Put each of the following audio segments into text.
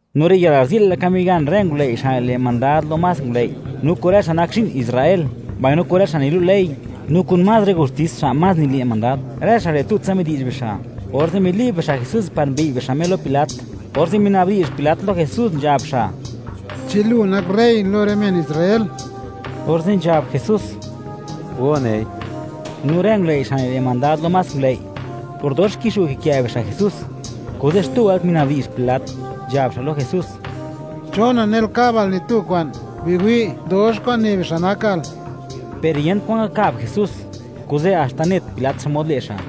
No riyë'l, garzi'l laka migan rë ngulëi' xa' nile' mandad lo más ngulëi', no kun rë men Israel xa' nak zhi'n, mbaino kun rë xa' nilu' ley, no kun más rë gustis xa' más nile' mandad; rë xa' re' tutsa midi'zh bixa'. Orze' mili'b bixa' Jesús par mbi'y bixa' Me lo Pilat. Orze' minabdi'zh Pilat lo Jesús, nzhab xa': ―¿Chi lu nak rey lo rë men Israel? Orze' nzhab Jesús: ―Go nei. No rë ngulëi' xa' nile' mandad lo más ngulëi', por dox kixu' kikë' bixa' Jesús, kuze' xtu wëlt minabdi'zh Pilat, nzhab xa' lo Jesús: ―¿Chon nanel kabal ni tu kwa'n? Biwi', dox kwa'n ne bixa' nakal. Per yent kwan ngakab Jesús, kuze' haxta net Pilat, xmod le' xa'.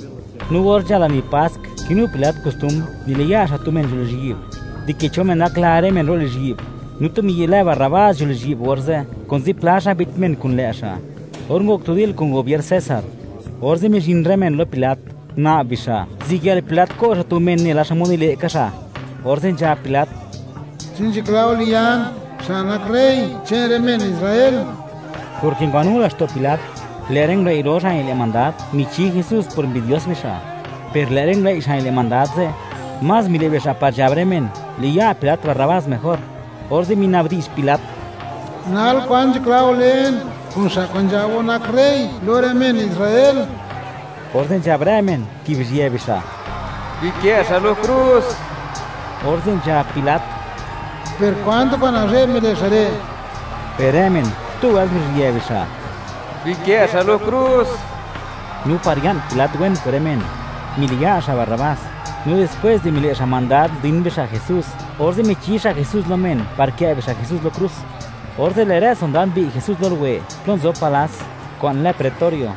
No or nzhal lani Pask, kinu Pilat kostumbr, niliya' xa' tu men nzho lizhyi'b, dike cho men gakla rë men ro' lizhyi'b. No tu miyi' lë Barrabás nzho lizhyi'b orze', kun zipla xa' mbit men kun lë' xa', or ngok tu dil kun gubier César. Orze' mizhin rë men lo Pilat, nguna'b bixa', ziyël Pilat ko' xa' tu men nela xmod nile' ka xa'. orze' nzhab Pilat: ―¿Chi nzhakla go liyan xa' nak rey che'n rë men Israel? Porke ngwanu laxto' Pilat, lë' rë ngulëi' ro xa' nile' mandad, michi Jesús por mbidios bixa'. Per lë' rë ngulëi' xa' nile' mandad ze', más mile' bixa' par nzhab rë men, liya' Pilat Barrabás mejor. Orze' minabdi'zh Pilat: ―¿Nal, kwan nzhakla go len kun xa' kwa'n nzhab go nak rey lo rë men Israel? Orze' nzhab rë men, kibizhië bixa': ―¡Bikë' xa' lo krus! Orze' nzhab Pilat: ―¿Per kwan tu kwa'n nazhe'b mile' xa' re'? Per rë men, xtu wëlt nguruzhië bixa': ―¡Bikë' xa' lo krus! No par ya'n Pilat wen kun rë men, miliya' xa' Barrabás, no dispwes di mile' xa' mandad ndin bixa' Jesús, orze' michi xa' Jesús lo men par kë' bixa' Jesús lo krus. Orze' lë' rë sondad mbi'y Jesús lo luwe plo nzob palas, kwa'n lë ‘pretorio.’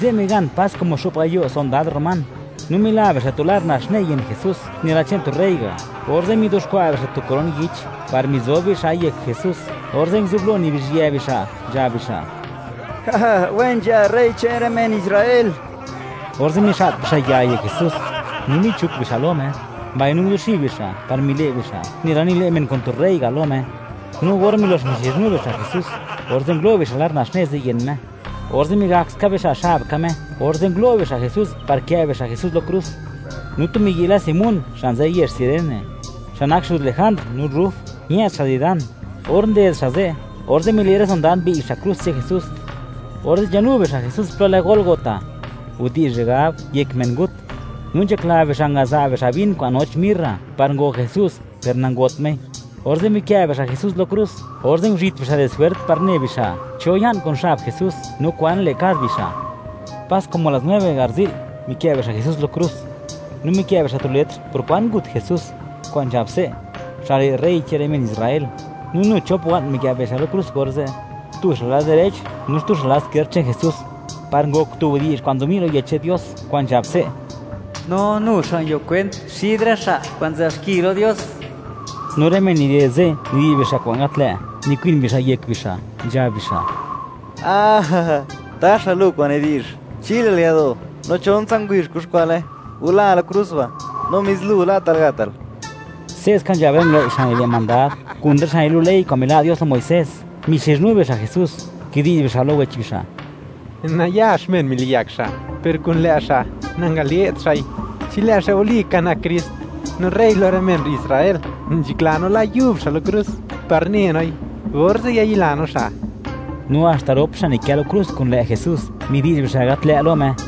Ze' migan pas como xo'p gayo' sondad román. No mila bixa' tu lar naxne yën Jesús, nela che'n tu rey ga'. Orze' mizuxkwa' bixa' tu koron yich, par mizob bixa'i yek Jesús, orze' nguzublo nibizhyë bixa', nzhab bixa': ―¡Wen nzha rey che'n rë men Israel! Orze' mixa't bixa' ya yek Jesús, no michuk bixa' lo Me, mbaino nguzuxib bixa' par mile' bixa' nela nile' men kun tu rey ga' lo Me. No or milox mixizhnu bixa' Jesús, orze' ngulo' bixa' lar naxne ze' yën Me, orze' migak ska bixa' xab ka Me, orze' ngulo' bixa' Jesús par kë' bixa' Jesús lo krus. No tu miyi' lë Simón, xa' nzë yezh Cirene, xa' nak xuz Lejandr no Ruf; ñë'd xa' di dan. Or nded xa' ze', orze' mile' rë sondad, mbi'y xa' krus che'n Jesús. Orze' nzhanu bixa' Jesús plo lë Gólgota (Widi'zh re' gab, Yek Men Ngut). No nzhakla bixa' ngaza' bixa' vin kwa'n noch mirra, par go' Jesús, per nangot Mei. Orze' mikë' bixa' Jesús lo krus, orze' nguzhit bixa' di swert, par ne bixa', cho ya'n kun xab Jesús, no kwan le' kad bixa'. Pas como las nueve garzi'l, mikë' bixa' Jesús lo krus. No mikë' bixa' tu letr por kwan ngut Jesús, kwa'n nzhab se': “Xa' re' rey che'n rë men Israel.” No nu chop wa'n mikë' bixa' lo krus orze'; tu xa' lad direch, no xtu xa' lad izkierd che'n Jesús, par ngok tu widi'zh kwa'n nzobni' lo Yech che'n Dios kwa'n nzhab se': “No nu xa' nguio kwent, xid rë xa' kwa'n nzë'b xki lo Dios.” No rë men nided ze', nidi'zh bixa' kwa'n gat lë', nikwin bixa' yek bixa', nzhab bixa': ―¡Taxa! ¡Lu kwa'n nidi'zh, chilal yado'; no chontsa ngubizh, kuxkwa'le! ¡Gula lo krus ba'; no mis lu, la'tal gatal! Se'ska nzhab rë ngulëi' xa' nile' mandad, kun rë xa' nilu' ley kwa'n mila' Dios lo Muisés, mixizhnu bixa' Jesús; kidi'zh bixa' lo wech bixa': ―Nayax men miliyak xa'; per kun lë' xa', nangale't xa'i. Chi lë' xa' walika nak Krist, no rey lo rë men Israel; ¡nzhakla no la xa' yub xa' lo krus, par ne noi, orze' yayila no xa'! No haxta rop xa' nikë lo krus kun lë' Jesús, midi'zh bixa' gat lë' lo Me.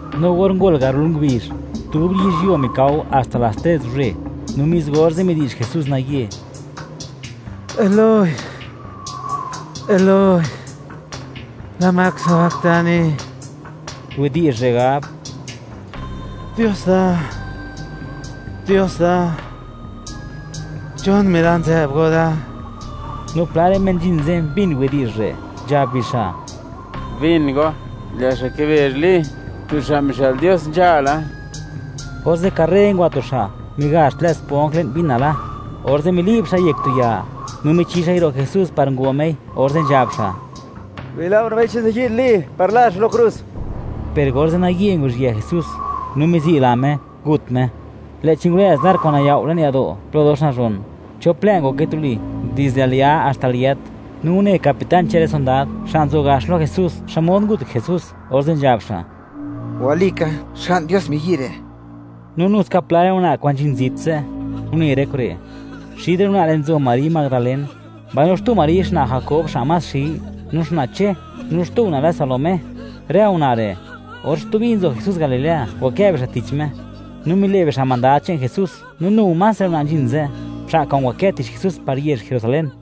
No or ngol garol ngubizh, dub yizhyuo mikao haxta las tres guzhe, no mis orze', midi'zh Jesús naye: ―¡Eloi, Eloi!, ¿lama sabactani? (Widi'zh re' gab: ¡Dios da, Dios da!, ¿chon mila' nzë'b go da?) No pla rë men nzhin ze' mbin widi'zh re'; nzhab bixa': “Bin go, lë' xa' kibezh Li, tu xa' mixë'l Dios nzhala.” Orze' karre ngwa tu xa', migazh tlë' sponj le'n vin nala; orze' mili'b xa'i yek tu ya, no michi xa'i ro' Jesús par ngo Mei, orze' nzhab xa': ―Bila' go, nabei chi ziyi'd Li, par la xa' lo krus. Per orze' naye nguru'zhië Jesús, no mizi'la Me; ngut Me, lë'chi ngurëz lar kwa'n nayao' le'n yado' plo dox nazhon; chop lë' ngoke tuli, dizde al ya haxta al yët. No une capitán che'n rë sondad, xa' nzo gax lo Jesús, xmod ngut Jesús, orze' nzhab xa': ―Walika, Xga'n Dios miyi' re'. No nu ska pla rë una' kwa'n nzhin zit ze', une rë kure'. Xid rë una' re' nzo Mari Madalén, mbaino xtu Mari xna' Jakob xa' más xi, no xna' Che; no xtu una' lë Salomé. Rë una' re', or stubi nzo Jesús Galilea, ngwakë bixa' tich Me, no mile' bixa' mandad che'n Jesús; no nu más rë una' nzhin ze', xa' kwa'n ngwakë tich Jesús par yezh Jerusalén.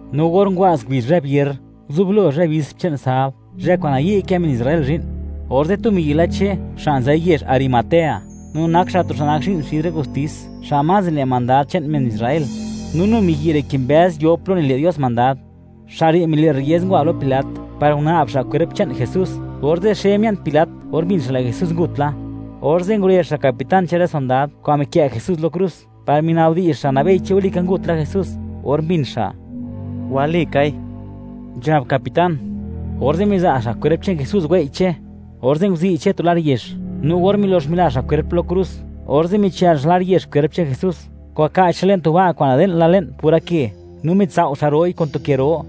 No or ngwa'z ngubizh zhë Vier, nguzublo zhë bispr che'n sabd, zhë kwa'n nayi' kë men Israel zhi'n, orze' tu miyi' lë Che, xa' nzë yezh Arimatea, no nak xa' tu xa' nak zhi'n xid rë gustis xa' más nile' mandad che'n men Israel, no nu miyi' re' kimbëz yo plo nile' Dios mandad; xa' re' mile' rriez, ngwa lo Pilat, par nguna'b xa' kwerp che'n Jesús. Orze' xe mia'n Pilat or mbin xa', lë' Jesús ngut la; orze' ngurezh xa' capitán che'n rë sondad kwa'n mikë' Jesús lo krus, par minabdi'zh xa', nabei chi walika ngut la Jesús. Or mbin xa': “Walikai”, nzhab capitán, orze' miza' xa' kwerp che'n Jesús wei' Che. Orze' nguzi' Che tu lar yex; no or milox mila xa' kwerp lo krus, orze' michël xa' lar yex kwerp che'n Jesús, ngwaka'ch xa'i le'n tu ba' kwa'n nade'n la le'n pura ke; no mitsao' xa' ro'i kun tu ke ro.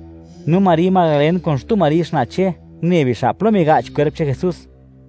No Mari Madalen kun xtu Mari xna' Che, une bixa' plo miga'ch kwerp che'n Jesús.